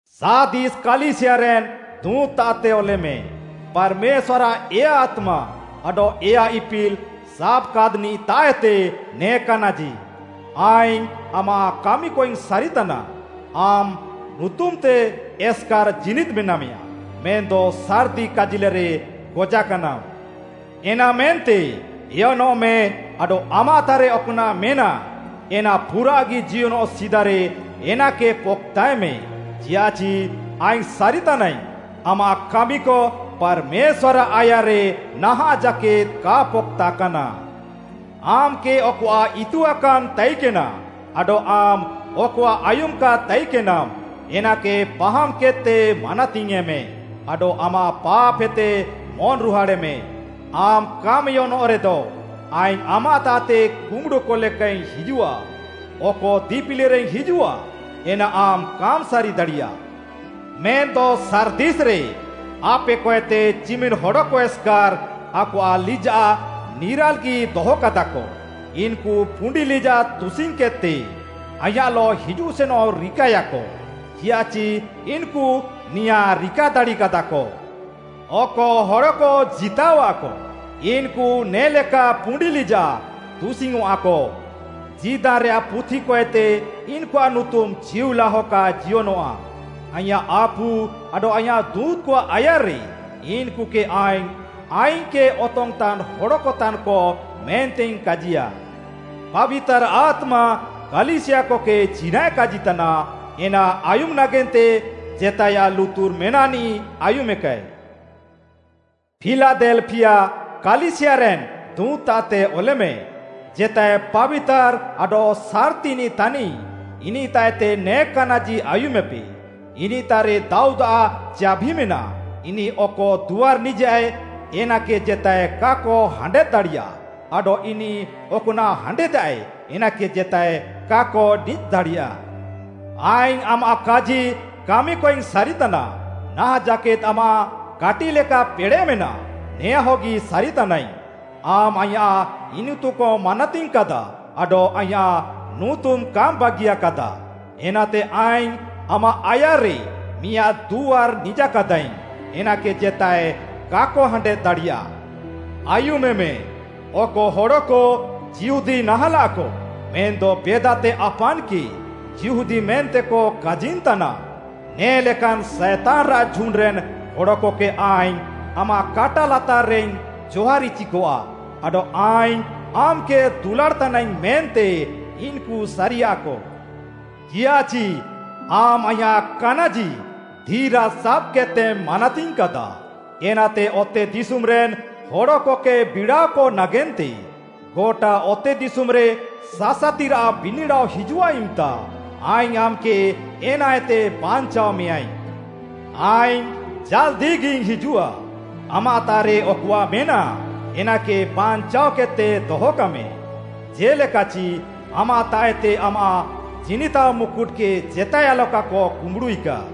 “ସାର୍ଦିସ୍ କାଲିସିୟାରେନ୍‌ ଦୁଁତ୍‌ତାଃତେ ଅଲେମେ, ପାର୍‌ମେଶ୍ୱାର୍‌ଆଃ ଏୟା ଆତ୍ମା ଆଡଃ ଏୟା ଇପିଲ୍‌ ସାବାକାଦ୍‌ନିଃତାଃଏତେ ନେ କାନାଜି। ଆଇଙ୍ଗ୍‌ ଆମାଃ କାମିକଇଙ୍ଗ୍‌ ସାରିତାନା, ଆମ୍‌ ନୁତୁମ୍‌ତେ ଏସ୍‌କାର୍‌ ଜୀନିଦ୍‌ ମେନାମେୟାଁ, ମେନ୍‌ଦ ସାର୍‌ତି କାଜିଲେରେ ଗଜାକାନାମ୍‌। ଏନାମେନ୍ତେ ଏୟନଃମେ ଆଡଃ ଆମାଃତାଃରେ ଅକଆଃ ମେନାଃ, ଏନା ପୁରାଃଗି ଜିୟନଃ ସିଦାରେ ଏନାକେ ପକ୍‌ତାଏମେ। ଚିୟାଃଚି ଆଇଙ୍ଗ୍‌ ସାରିତାନାଇଙ୍ଗ୍‌, ଆମାଃ କାମିକ ପାର୍‌ମେଶ୍ୱାର୍‌ଆଃ ଆୟାର୍‌ରେ ନାହାଁଃ ଜାକେଦ୍‌ କା ପକ୍‌ତାକାନା। ଆମ୍‌କେ ଅକଆଃ ଇତୁଆକାନ୍‌ ତାଇକେନା ଆଡଃ ଆମ୍‌ ଅକଆଃ ଆୟୁମାକାଦ୍‌ ତାଇକେନାମ୍‌, ଏନାକେ ପାହାମ୍‌କେଦ୍‌ତେ ମାନାତିୟେଁମେ ଆଡଃ ଆମାଃ ପାପ୍‌ହେତେ ମନ୍‌ରୁହାଡ଼୍‌ମେ। ଆମ୍‌ କାମ୍‌ ଏୟନଃରେଦ, ଆଇଙ୍ଗ୍‌ ଆମାଃତାଃତେ କୁମ୍ବୁଡ଼ୁକ ଲେକାଇଙ୍ଗ୍‌ ହିଜୁଃଆ। ଅକ ଦିପିଲିରେଇଙ୍ଗ୍‌ ହିଜୁଃଆ, ଏନା ଆମ୍‌ କାମ୍‌ ସାରିଦାଡ଼ିୟା। ମେନ୍‌ଦ ସାର୍ଦିସ୍‌ରେ ଆପେକଏତେ ଚିମିନ୍‌ ହଡ଼କ ଏସ୍‌କାର୍‌ ଆକଆଃ ଲିଜାଃ ନିରାଲ୍‌ଗି ଦହକାଦାକ। ଇନ୍‌କୁ ପୁଣ୍ଡି ଲିଜାଃ ତୁସିଙ୍ଗ୍‌କେଦ୍‌ତେ ଆଇଁୟାଃଲଃ ହିଜୁଃସେନଃ ରିକାଏୟାକ, ଚିଆଃଚି ଇନ୍‌କୁ ନେଆଁ ରିକା ଦାଡ଼ିକାଦାକ। ଅକ ହଡ଼କ ଜିତାଅୱାଃକ, ଇନ୍‌କୁ ନେ'ଲେକା ପୁଣ୍ଡି ଲିଜାଃ ତୁସିଙ୍ଗ୍‌ଅଁଃଆକ। ଜୀଦାନ୍‌ରେୟାଃ ପୁଥିକଏତେ ଇନ୍‌କୁଆଃ ନୁତୁମ୍‌ ଚିଉଲାହ କା ଜିୟନଃଆ। ଆଇଁୟାଃ ଆପୁ ଆଡଃ ଆୟାଃ ଦୁଁତ୍‌କଆଃ ଆୟାର୍‌ରେ ଇନ୍‌କୁକେ ଆଇଙ୍ଗ୍‌, ଆଇଙ୍ଗ୍‌କେ ଅତଙ୍ଗ୍‌ତାନ୍‌ ହଡ଼କତାନ୍‌କ ମେନ୍ତେଇଙ୍ଗ୍‌ କାଜିୟା। “ପାବିତାର୍‌ ଆତ୍ମା କାଲିସିୟାକକେ ଚିନାଃଏ କାଜିତାନା, ଏନା ଆୟୁମେ ନାଗେନ୍ତେ ଜେତାଏୟାଃ ଲୁତୁର୍ ମେନାଃନିଃ ଆୟୁମେକାଏ। “ଫିଲାଦେଲ୍‍ଫିୟା କାଲିସିୟାରେନ୍‌ ଦୁଁତ୍‌ତାଃତେ ଅଲେମେ, ଜେତାଏ ପାବିତାର୍‌ ଆଡଃ ସାର୍‌ତିନିଃ ତାନିଃ, ଇନିଃତାଃଏତେ ନେ କାନାଜି ଆୟୁମେପେ, ଇନିଃତାଃରେ ଦାଉଦ୍‌ଆଃ ଚାଭି ମେନାଃ, ଇନିଃ ଅକ ଦୁଆର୍‌ ନିଜାଃଏ, ଏନାକେ ଜେତାଏ କାକ ହାଣ୍ଡେଦ୍‌ ଦାଡ଼ିୟା ଆଡଃ ଇନିଃ ଅକ୍‌ନାଃ ହାଣ୍ଡେଦାଃଏ, ଏନାକେ ଜେତାଏ କାକ ନିଜ୍‌ ଦାଡ଼ିୟା। ଆଇଙ୍ଗ୍‌ ଆମାଃ କାଜି କାମିକଇଙ୍ଗ୍‌ ସାରିତାନା, ନାହାଁଃ ଜାକେଦ୍‌ ଆମାଃ କାଟିଃଲେକା ପେଡ଼େଃ ମେନାଃ, ନେଆଁହଗି ସାରିତାନାଇଙ୍ଗ୍‌। ଆମ୍‌ ଆଇଁୟାଃ ଇନିତୁକମ୍‌ ମାନାତିଙ୍ଗ୍‌କାଦା ଆଡଃ ଆଇଁୟାଃ ନୁତୁମ୍‌ କାମ୍‌ ବାଗିୟାକାଦା। ଏନାତେ ଆଇଙ୍ଗ୍‌ ଆମାଃ ଆୟାର୍‌ରେ ମିଆଁଦ୍‌ ଦୁଆର୍‌ ନିଜାକାଦାଇଙ୍ଗ୍‌, ଏନାକେ ଜେତାଏ କାକ ହାଣ୍ଡେଦ୍‌ ଦାଡ଼ିୟା। ଆୟୁମେମେ, ଅକ ହଡ଼କ ଯିହୁଦୀ ନାହାଁଲାଃକ, ମେନ୍‌ଦ ବେଦାତେ ଆପାନ୍‌କେ ଯିହୁଦୀ ମେନ୍ତେକ କାଜିନ୍‌ତାନା, ନେ'ଲେକାନ୍‌ ସାଏତାନ୍‌ରାଃ ଝୁଣ୍ଡ୍‌ରେନ୍‌ ହଡ଼କକେ ଆଇଙ୍ଗ୍‌ ଆମାଃ କାଟା ଲାତାର୍‌ରେଇଙ୍ଗ୍‌ ଜହାର୍‌ଇଚିକଆ। ଆଡଃ ଆଇଙ୍ଗ୍‌ ଆମ୍‌କେ ଦୁଲାଡ଼୍‌ତାନାଇଙ୍ଗ୍‌ ମେନ୍ତେ ଇନ୍‌କୁ ସାରିୟାକ। ଚିୟାଃଚି ଆମ୍‌ ଆଇଁୟାଃ କାନାଜି ଧିରାଜ୍‌ ସାବ୍‌କେଦ୍‌ତେମ୍‌ ମାନାତିଙ୍ଗ୍‌କାଦା। ଏନାତେ ଅତେଦିଶୁମ୍‌ରେନ୍‌ ହଡ଼କକେ ବିଡ଼ାଅକ ନାଗେନ୍ତେ ଗଟା ଅତେଦିଶୁମ୍‌ରେ ସାସାତିରାଃ ବିନିଡ଼ାଅ ହିଜୁଃଆ ଇମ୍‌ତା ଆଇଙ୍ଗ୍‌ ଆମ୍‌କେ ଏନାଏତେ ବାଞ୍ଚାଅମେୟାଁଇଙ୍ଗ୍‌। ଆଇଙ୍ଗ୍‌ ଜାଲ୍‌ଦିଗିଇଙ୍ଗ୍‌ ହିଜୁଃଆ, ଆମାଃତାଃରେ ଅକଆଃ ମେନାଃ, ଏନାକେ ବାଞ୍ଚାଅକେଦ୍‌ତେ ଦହକାମେ, ଜେ'ଲେକାଚି ଆମାଃତାଃଏତେ ଆମାଃ ଜିନିତାଅ ମୁକୁଟ୍‌କେ ଜେତାଏ ଆଲକାକ କୁମ୍ବୁଡ଼ୁଇକା।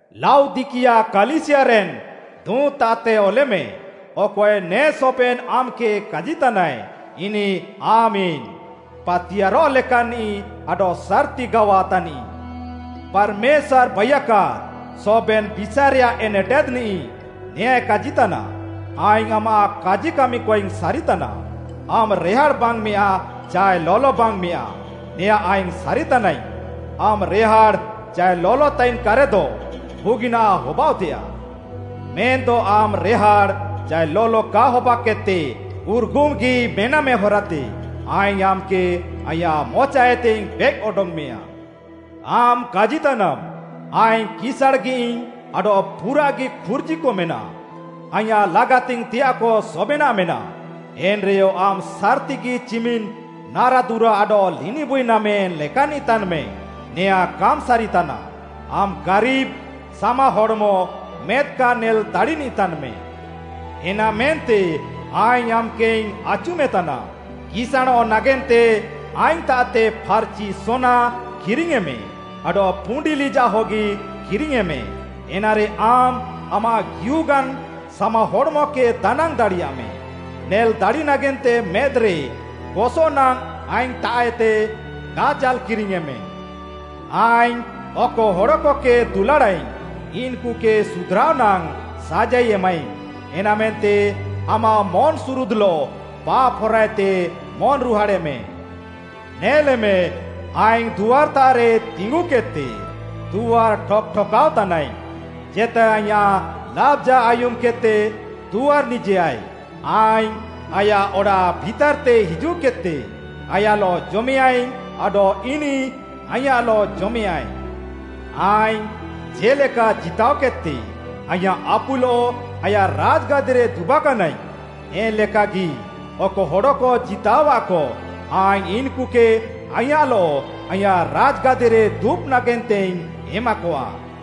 “ଲାଉଦିକିଆ କାଲିସିୟାରେନ୍‌ ଦୁଁତ୍‌ତାଃତେ ଅଲେମେ, ଅକଏ ନେ ସବେନ୍‌ ଆମ୍‌କେ କାଜିତାନାଏ, ଇନିଃ ଆମେନ୍‌, ପାତିୟାର୍‌ରଃ ଲେକାନ୍‌ନିଃ ଆଡଃ ସାର୍‌ତି ଗାୱା ତାନିଃ। ପାର୍‌ମେଶ୍ୱାର୍‌ ବାଇୟାକାଦ୍‌ ସବେନ୍‌ ବିଷାଏରେୟାଃ ଏନେଟେଦ୍‌ନିଃ, ନେଆଁଏ କାଜିତାନା, ଆଇଙ୍ଗ୍‌ ଆମାଃ କାଜି କାମିକଇଙ୍ଗ୍‌ ସାରିତାନା, ଆମ୍‌ ରେହାଡ଼୍‌ ବାଙ୍ଗ୍‌ମେୟାଁ ଚାଏ ଲଲ ବାଙ୍ଗ୍‌ମେୟାଁ, ନେଆଁ ଆଇଙ୍ଗ୍‌ ସାରିତାନାଇଙ୍ଗ୍‌। ଆମ୍‌ ରେହାଡ଼୍‌ ଚାଏ ଲଲ ତାଇନ୍‌କାରେଦ, ବୁଗିନାଃ ହବାଅଃତେୟାଃ। ମେନ୍‌ଦ ଆମ୍‌ ରେହାଡ଼୍‌ ଚାଏ ଲଲ କା ହବାକେଦ୍‌ତେ ଉର୍‌ଗୁମ୍‌ଗି ମେନାମେ ହରାତେ, ଆଇଙ୍ଗ୍‌ ଆମ୍‌କେ ଆଇଁୟାଃ ମଚାଏତେଇଙ୍ଗ୍‌ ବେଏକ୍‌ ଅଡଙ୍ଗ୍‌ମେୟାଁ। ଆମ୍‌ କାଜିତାନାମ୍‌, ‘ଆଇଙ୍ଗ୍‌ କିସାଁଣ୍‌ଗିୟାଇଙ୍ଗ୍‌ ଆଡଃ ପୁରାଃଗି ଖୁର୍ଜିକ ମେନାଃ, ଆଇଁୟାଃ ଲାଗାତିଙ୍ଗ୍‌ତେୟାଃକ ସବେନାଃ ମେନାଃ।’ ଏନ୍‌ରେୟ ଆମ୍‌ ସାର୍‌ତିଗି ଚିମିନ୍‌ ନାରାଦୁରା ଆଡଃ ଲିନିବୁଇ ନାମେ ଲେକାନିଃ ତାନ୍‌ମେ, ନେଆଁ କାମ୍‌ସାରିତାନା। ଆମ୍‌ ଗାରିବ୍‌, ସାମାହଡ଼୍‌ମ, ମେଦ୍‌ କା ନେଲ୍‌ ଦାଡ଼ିନିଃ ତାନ୍‌ମେ। ଏନାମେନ୍ତେ ଆଇଙ୍ଗ୍‌ ଆମ୍‌କେଇଙ୍ଗ୍‌ ଆଚୁମେତାନା, କିସାଁଣଃ ନାଗେନ୍ତେ ଆଇଙ୍ଗ୍‌ତାଃଏତେ ଫାର୍‌ଚି ସୋନା କିରିଙ୍ଗ୍‌ୟେଁମେ, ଆଡଃ ପୁଣ୍ଡି ଲିଜାଃ ହଗି କିରିଙ୍ଗ୍‌ୟେଁମେ, ଏନାରେ ଆମ୍‌ ଆମାଃ ଗିହୁଗାନ୍‌ ସାମାହଡ଼୍‌ମକେ ଦାନାଙ୍ଗ୍‌ ଦାଡ଼ିୟାମେ। ନେଲ୍‌ ଦାଡ଼ି ନାଗେନ୍ତେ ମେଦ୍‌ରେ ଗସଃ ନାଙ୍ଗ୍‌ ଆଇଙ୍ଗ୍‌ତାଃଏତେ କାଜାଲ୍‌ କିରିଙ୍ଗ୍‌ୟେଁମେ। ଆଇଙ୍ଗ୍‌ ଅକ ହଡ଼କକେ ଦୁଲାଡ଼ାଃଇଙ୍ଗ୍‌, ଇନ୍‌କୁକେ ସୁଧ୍‌ରାଅ ନାଙ୍ଗ୍‌ ସାଜାଇ ଏମାଃଇଙ୍ଗ୍‌। ଏନାମେନ୍ତେ ଆମାଃ ମନ୍‌ସୁରୁଦ୍‌ଲଃ ପାପ୍‌ ହରାଏତେ ମନ୍‌ରୁହାଡ଼େମେ। ନେଲେମେ, ଆଇଙ୍ଗ୍‌ ଦୁଆର୍‍ତାଃରେ ତିଙ୍ଗୁକେଦ୍‌ତେ ଦୁଆର୍‌ ଠକ୍‌ ଠକାଅ ତାନାଇଙ୍ଗ୍‌, ଜେତାଏ ଆଇଁୟାଃ ଲାବ୍‌ଜା ଆୟୁମ୍‌କେଦ୍‌ତେ ଦୁଆର୍‌ ନିଜେୟାଏ, ଆଇଙ୍ଗ୍‌ ଆୟାଃ ଅଡ଼ାଃ ଭିତାର୍‌ତେ ହିଜୁଃକେଦ୍‌ତେ ଆୟାଃଲଃ ଜମେୟାଁଇଙ୍ଗ୍‌ ଆଡଃ ଇନିଃ ଆଇଁୟାଃଲଃ ଜମେୟାଁଏ। ଆଇଙ୍ଗ୍‌ ଜେ'ଲେକା ଜିତାଅକେଦ୍‌ତେ, ଆଇଁୟାଃ ଆପୁଲଃ ଆୟାଃ ରାଜ୍‌ଗାଦିରେ ଦୁବାକାନାଇଙ୍ଗ୍‌, ଏନ୍‌ ଲେକାଗି ଅକ ହଡ଼କ ଜିତାଅୱାଃକ, ଆଇଙ୍ଗ୍‌ ଇନ୍‌କୁକେ ଆଇଁୟାଃଲଃ ଆଇଁୟାଃ ରାଜ୍‌ଗାଦିରେ ଦୁବ୍‌ ନାଗେନ୍ତେଇଙ୍ଗ୍‌ ଏମାକଆ।